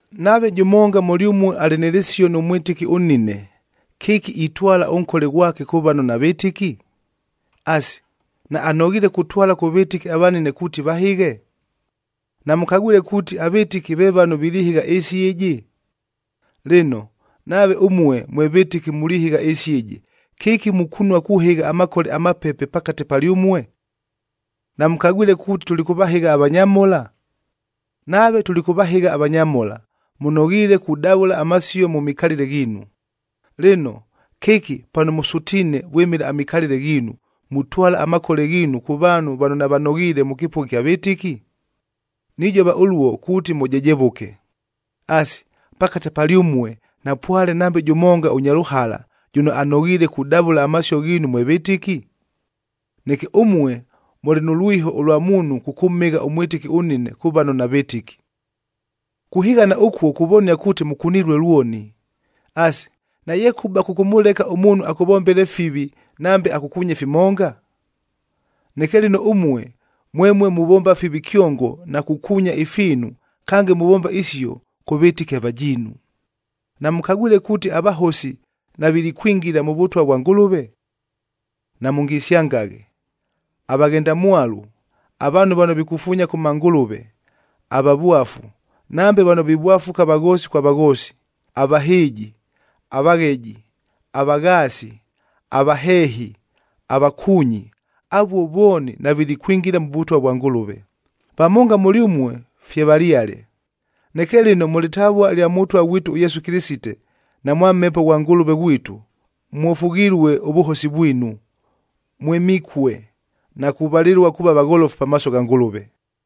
Nave jʉmonga mʉlyʉmue alɨ nɨ lɨsio nʉ mwɨtɨki ʉnnine, kɨki itwala ʉnkole ghwake kʉ vano navɨtɨki? Asi, naanoghiile kutwala kʉ vɨtɨki avanine kuuti vahɨghe? Namʉkagwile kuuti avɨtɨki ve vano vilihɨgha ɨɨsi ɨjɨ? Lɨno, nave ʉmue mwe vɨtɨki mulihɨgha ɨɨsi ɨjɨ, kɨki mukunua kuhɨgha amakole amapepe pakate palyʉmue? Namʉkagwile kuuti tulikʉvahɨgha avanyamhola? Nave tulikʉvahɨgha avanyamhola, mʉnoghiile kudavʉla amasio mʉ mikalɨle ghiinu. Lɨno, kɨki pano mʉsʉtiine vwɨmɨla amikalɨle ghiinu, mutwala amakole ghiinu kʉ vaanhu vano navanoghiile mʉ kɨpʉgha ɨkya vɨtɨki? Nijova ʉluo kuuti mʉjejevʉke. Asi, pakate palyʉmue napwale nambe jʉmonga ʉnya lʉhala, jʉno anoghiile kudavʉla amasio ghiinu mwe vɨtɨki? Neke ʉmue, mʉlɨ nʉ lwiho ʉlwa muunhu kʉkʉmhɨgha ʉmwɨtɨki ʉnnine kʉ vano navɨtɨki! Kuhɨghana ʉkuo kuvonia kuuti mʉkunilue lwoni. Asi, nayekʉba kʉkʉmʉleka ʉmuunhu akʉvombele fivi nambe akʉkuunye fimonga? Neke lɨno ʉmue, mwemue muvomba fivi kyongo na kukuunya ifiinu, kange muvomba isio kʉ vɨtɨki avajiinu! Namʉkagwile kuuti avahosi navilikwingila mʉ Vʉtwa vwa Ngʉlʉve? Namʉngisyangaghe! Avaghendamwalu, avaanhu vano vikufuunya kʉ mangʉlʉve, avavwafu, nambe vano vivwafuka vaghoosi kwa vaghoosi, avahɨɨji, avagheji, avaghaasi, avaheehi, avakuunyi, avuo vooni navilikwingila mʉ Vʉtwa vwa Ngʉlʉve. Vamonga mʉlyʉmue fye valyale. Neke lɨno mʉ lɨtavua lya Mʉtwa ghwitu ʉYesu Kɨlɨsite, na mwa Mhepo ghwa Ngʉlʉve ghwitu, mwofughilue ʉvʉhosi vwinu, mwɨmikue, na kuvalɨlua kuuva vagholofu pamaaso gha Ngʉlʉve.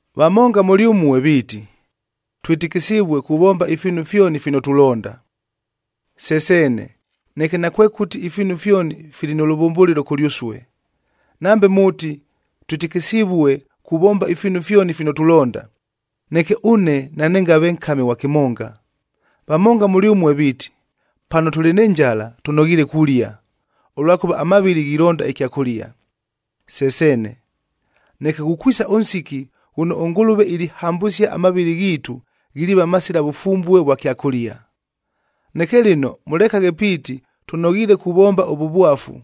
Vamonga mʉlyʉmue viiti, “Twɨtɨkɨsivue kuvomba ifiinu fyoni fino tulonda.” Se seene, neke nakwekʉti ifiinu fyoni fili nʉ lʉvʉmbʉlɨlo kʉlyʉsue. Nambe mʉʉti, “Twɨtɨkɨsivue kuvomba ifiinu fyoni fino tulonda,” neke ʉne nanɨngave nkami ghwa kɨmonga. Vamonga mʉlyʉmue viiti, “Pano tʉlɨ nɨ njala tʉnoghiile kulia, ʉlwakʉva amavɨlɨ ghilonda ɨkyakʉlia.” Se seene, neke ghukwisa ʉnsiki ghʉno ʉNgʉlʉve ilihambʉsia amavɨlɨ ghiitu ghiliiva masila vʉfumbue vwa kyakʉlia. Neke lɨno mʉlekaghe piiti tʉnoghiile kuvomba ʉvʉvwafu,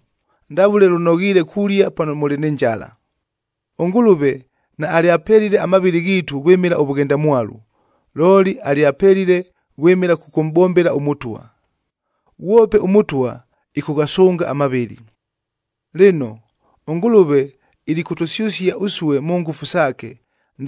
ndavʉle lʉnoghiile kulia pano mʉlɨ nɨ njala. ɄNgʉlʉve naalyapelile amavɨlɨ ghiitu vwɨmɨla ʉvʉghendamwalu, looli alyapelile vwɨmɨla kʉkʉmʼbombela ʉMʉtwa, ghwope ʉMʉtwa ɨkʉghasʉnga amavɨlɨ. Lɨno, ʉNgʉlʉve ilikʉtʉsyʉsia ʉsue mʉ ngʉfu saake,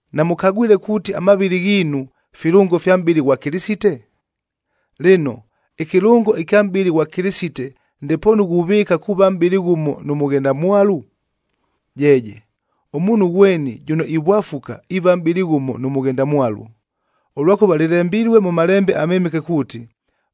Namʉkagwile kuuti amavɨlɨ ghiinu, filʉngo fya mʼbɨlɨ ghwa Kɨlɨsite? Lɨno, ɨkɨlʉngo ɨkya mʼbɨlɨ ghwa Kɨlɨsite ndepoonu ghuvɨɨka kuuva mʼbɨlɨ ghʉmo nʉ mʉghendamwalu? Jeeje! Ʉmuunhu ghweni jʉno ivwafuka iiva mʼbɨlɨ ghʉmo nʉ mʉghendamwalu. Ʉlwakʉva lɨlembilue mʉ Malembe aMɨmɨke kuuti,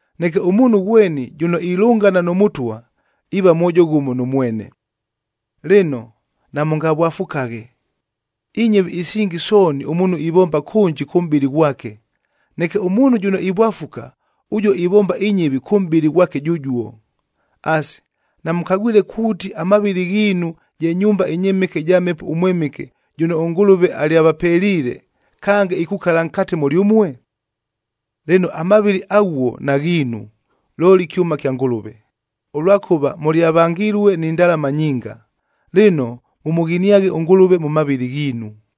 Neke ʉmuunhu ghweni jʉno ilʉngana nʉ Mʉtwa, iiva mwojo ghʉmo nʉ mwene. Lɨno, namʉngavwafukaghe. Inyɨvi isingi sooni ʉmuunhu ivomba kʉnji kʉ mʼbɨlɨ ghwake, neke ʉmuunhu jʉno ivwafuka, ʉjuo ivomba inyɨvi kʉ mʼbɨlɨ ghwake jʉjuo. Asi, namʉkagwile kuuti, amavɨlɨ ghiinu je nyumba ɨnyɨmɨke ɨja Mhepo ʉMwɨmɨke jʉno ʉNgʉlʉve alyavapeliile, kange ikukala nkate mʉlyʉmue? Lɨno, amavɨlɨ aghuo naghiinu, looli kyʉma kya Ngʉlʉve, ʉlwakʉva mʉlyavangilue ni ndalama nyinga. Lɨno, mʉmʉghiniaghe ʉNgʉlʉve mʉ mavɨlɨ ghiinu.